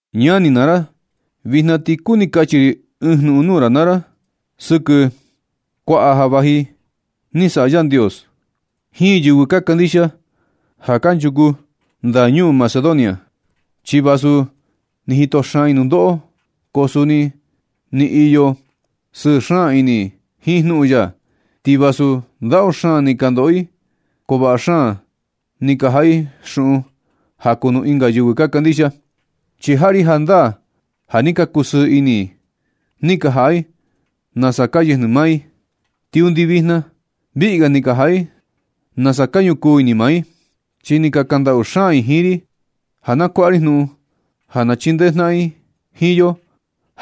Ñani naa ra, vijna ti kuni kachi ri ɨɨn jnuꞌun nuu ra naa ra sɨkɨ kuaꞌa ja vaꞌa ni saꞌa Yandios jiin yɨvɨ ka kandixia ja kanchuku ndañuu Macedonia. Chi vasu ni jito xaan i nundoꞌo, ko suni ni iyo sɨɨ xaan ini i jiin jnuꞌun ya. Ti vasu ndaꞌu xaan ni ka ndoꞌo i, ko vaꞌa xaan ni ka jaꞌa i xuꞌun ja kuu nuu ɨnga yɨvɨ ka kandixia. Chi jaꞌa ri jandaa ja ni ka kusɨɨ ini i ni ka jaꞌa i nasa ka yɨjnɨ maa i, ti undi vijna viꞌi ga ni ka jaꞌa i nasa ka ñukuu ini maa i. Chi ni ka kaꞌan ndaꞌu xaan i jiin ri, ja na kuaꞌa ri jnuꞌun ja na chindee jnaꞌan i jiin yo,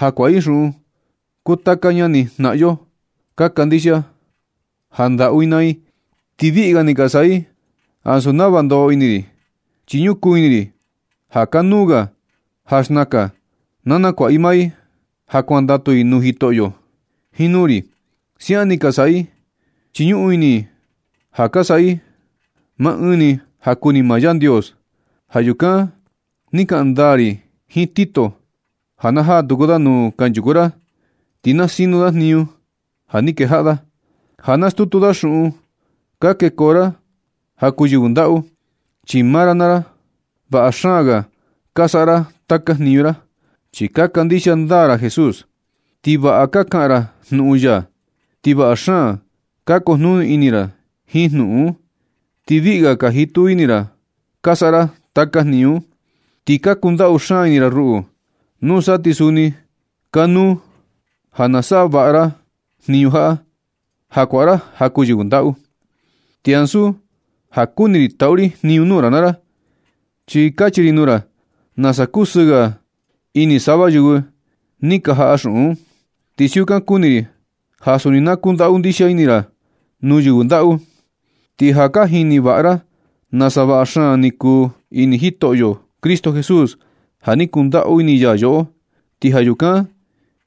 ja kuaꞌa i xuꞌun kuu taka ñani jnaꞌan yo ka kandixia ja ndaꞌu i naa i. Ti viꞌi ga ni ka saꞌa i ansu nava ndoꞌo ini ri, chi ñukuu ini i ja kanuu ga ja xnakan na nakuaꞌa i maa i ja kuandatu i nuu Jitoꞌyo jiin nuu ri. Siaꞌan ni ka saꞌa i, chi ñuꞌun ini i ja ka saꞌa i maa ɨɨn ni ja kuni maa Yandios. Ja yukan ni kaꞌan ndaa ri jiin Tito ja na jaa tuku da nuu kanchuku ra, ti na sino da jniñu ja ni kejaꞌa da, ja nastutu da xuꞌun ka kekoo ra ja kuu yɨvɨ ndaꞌu. Chi maa ra naa ra, vaꞌa xaan ga ka saꞌa ra taka jniñu ra, chi ka kandixia ndaa ra Jesús. Ti vaꞌa ka kaꞌan ra jnuꞌun ya, ti vaꞌa xaan ka kujnuni ini ra jiin jnuꞌun un. Ti viꞌi ga ka jitu ini ra ka saꞌa ra taka jniñu un. Ti ka kundaꞌu xaan ini ra ruꞌu. Nusa ti suni kanuu ja na saꞌa vaꞌa ra jniñu jaꞌa, ja kuaꞌa ra ja kuu yɨvɨ ndaꞌu. Ti ansu ja kuni ri taꞌu ri jniñu nuu ra naa ra, chi kachi ri nuu ra nasa kusɨɨ ga ini sava yɨvɨ ni ka jaꞌa xuꞌun un. Ti siukan kuni ri ja suni na kundaꞌu ndixia ini ra nuu yɨvɨ ndaꞌu. Ti ja ka jini vaꞌa ra nasa vaꞌa xaan ni kuu ini Jitoꞌyo Cristo Jesús, ja ni kundaꞌu ini ya yoꞌo, ti ja yukan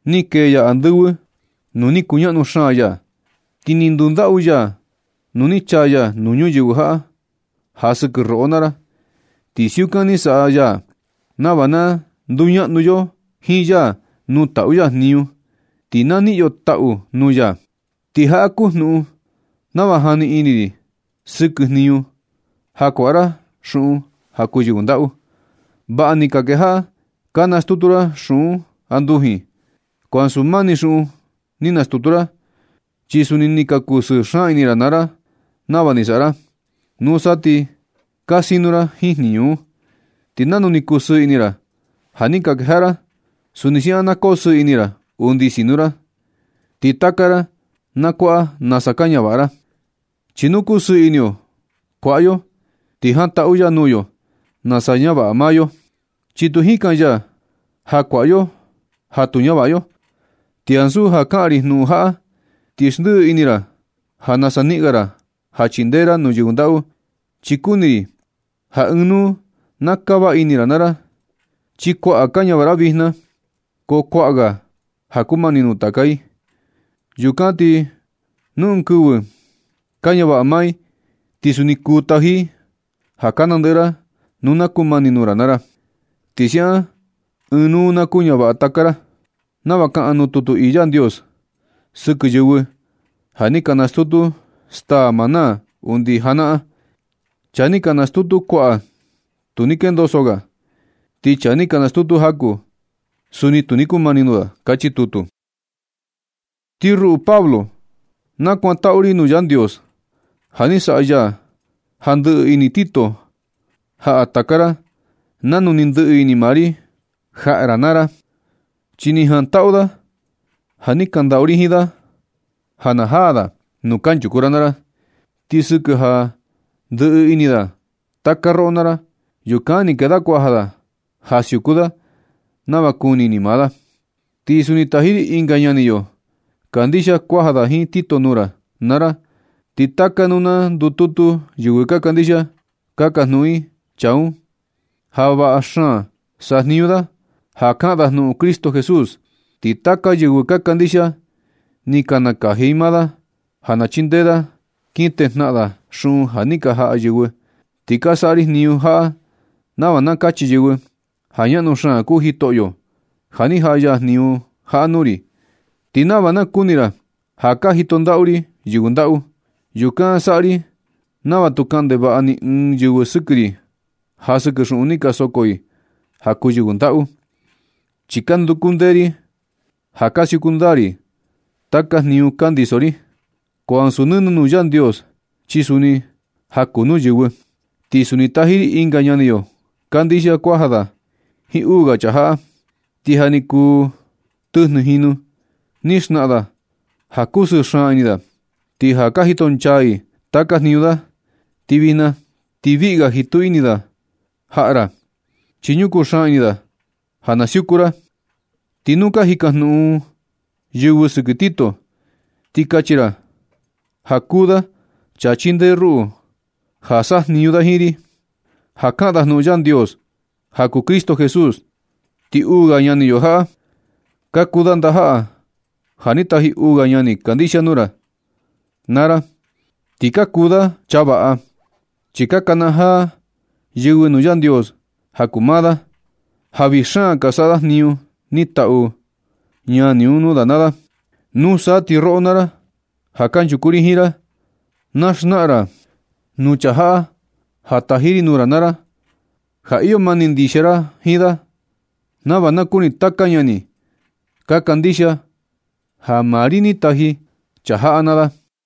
ni kee ya andɨvɨ nuu ni kuñaꞌnu xaan ya. Ti ni ndundaꞌu ya nu ni chaa ya nuu ñuyɨvɨ jaꞌa ja sɨkɨ roꞌo naa ra. Ti siukan ni saꞌa ya nava na nduñaꞌnu yo jiin ya nuu taꞌu ya jniñu, ti na niꞌin yo taꞌu nuu ya. Ti jaꞌa kuu jnuꞌun nava jani ini ri sɨkɨ jniñu ja kuaꞌa ra xuꞌun ja kuu yɨvɨ ndaꞌu. Vaꞌa ni ka kejaꞌa ka nastutu ra xuꞌun andujin. Ko ansu maa ni xuꞌun ni nastutu ra, chi suni ni ka kusɨɨ xaan ini ra naa ra nava ni saꞌa ra. Nusa ti ka sinu ra jiin jniñu un. Ti nanu ni kusɨɨ ini ra ja ni ka kejaꞌa ra, suni siaꞌan na kosɨɨ ini ra undi sinu ra, ti taka ra na kuaꞌa nasa ka ñavaꞌa ra. Chi nu kusɨɨ ini yo kuaꞌa yo, ti jantaꞌu ya nuu yo nasa ñavaꞌa maa yo, chi tu jikan ya ja kuaꞌa yo ja tu ñavaꞌa yo. Ti ansu ja kaꞌan ri jnuꞌun jaꞌa, ti xndiꞌi ini ra ja nasa niꞌin ga ra ja chindee ra nuu yɨvɨ ndaꞌu, chi kuni ri ja ɨɨn nuu na kava ini ra naa ra. Chi kuaꞌa ka ñavaꞌa ra vijna, ko kuaꞌa ga ja kumani nuu taka i. Yukan ti nu ɨɨn kɨvɨ ka ñavaꞌa maa i, ti suni kuu taji i ja ka nandɨꞌɨ ra nu na kumani nuu ra naa ra. Ti siukan ɨɨn nuu na kuñavaꞌa taka ra, nava kaꞌan nuu tutu ii Yandios sɨkɨ yɨvɨ ja ni ka nastutu staa maná undi janaꞌan: “Chaa ni nastutu kuaꞌa, tu ni kendoso ga. Ti chaa ni nastutu jaku ni, suni tu ni kumani nuu da”, kachi tutu. Ti ruꞌu Pablo, na kuantaꞌu ri nuu Yandios ja ni saꞌa ya ja ndɨꞌɨ ini Tito jaꞌa taka ra nanu ni ndɨꞌɨ ini maa ri jaꞌa ra naa ra. Chi ni jantaꞌu da ja ni kaꞌan ndaꞌu ri jiin da ja na jaa da nuu kanchuku ra naa ra. Ti sɨkɨ ja ndɨꞌɨ ini da taka roꞌo naa ra, yukan ni kee da kuaja da ja siuku da nava kuni ini maa da. Ti suni taji ri ɨnga ñani yo kandixia kuaja da jiin Tito nuu ra naa ra. Ti taka nuu ka ndututu yɨvɨ ka kandixia, ka jajnuꞌun i chaa un ja vaꞌa xaan sajniñu da, ja kaꞌan da jnuꞌun Cristo Jesús. Ti taka yɨvɨ ka kandixia, ni ka nakaji i maa da ja na chindee da kin tejnaꞌan da xuꞌun ja ni ka jaꞌa yɨvɨ. Ti ka saꞌa ri jniñu jaꞌa nava na kachi yɨvɨ ja ñaꞌnu xaan kuu Jitoꞌyo, ja ni jaꞌa ya jniñu jaꞌa nuu ri, ti nava na kuni ra ja ka jito ndaꞌu ri yɨvɨ ndaꞌu. Yukan ka saꞌa ri nava tu kaꞌan ndevaꞌa ni ɨɨn yɨvɨ sɨkɨ ri ja sɨkɨ xuꞌun ni ka soko i ja kuu yɨvɨ ndaꞌu. Chi ka nduku ndee ri ja ka siuku ndaa ri taka jniñu ka ndiso ri, ko ansu nɨnɨ nuu Yandios, chi suni ja kuu nuu yɨvɨ. Ti suni taji ri ɨnga ñani yo kandixia kuaja da jiin uu ga chaa jaꞌa. Ti ja ni kuu tɨjnɨ jinu ni xnaꞌan da ja kusɨɨ xaan ini da, ti ja ka jito nchaa i taka jniñu da. Ti vijna ti viꞌi ga jitu ini da jaꞌa ra, chi ñukuu xaan ini da ja na siuku ra. Ti nu ka jikajnuꞌun yɨvɨ sɨkɨ Tito, ti kachi ra ja kuu da chaa chindee ruꞌu ja sajniñu da jiin ri, ja kaꞌan da jnuꞌun Yandios ja kuu Cristo Jesús. Ti uu ga ñani yo jaꞌa, ka kuu da ndajaꞌa ja ni taji uu ga ñani kandixia nuu ra naa ra. Ti ka kuu da chaa vaꞌa, chi ka nakanajaa yɨvɨ nuu Yandios ja kuu maa da, ja vii xaan ka saꞌa da jniñu ni taꞌu ñani un nuu da naa da. Nusa ti roꞌo naa ra, ja kanchuku ri jiin ra, na xnaꞌan ra nuu chaa jaꞌa ja taji ri nuu ra naa ra, ja iyo mani ndixia ra jiin da, nava na kuni taka ñani ka kandixia ja maa ri ni taji chaa jaꞌa naa da.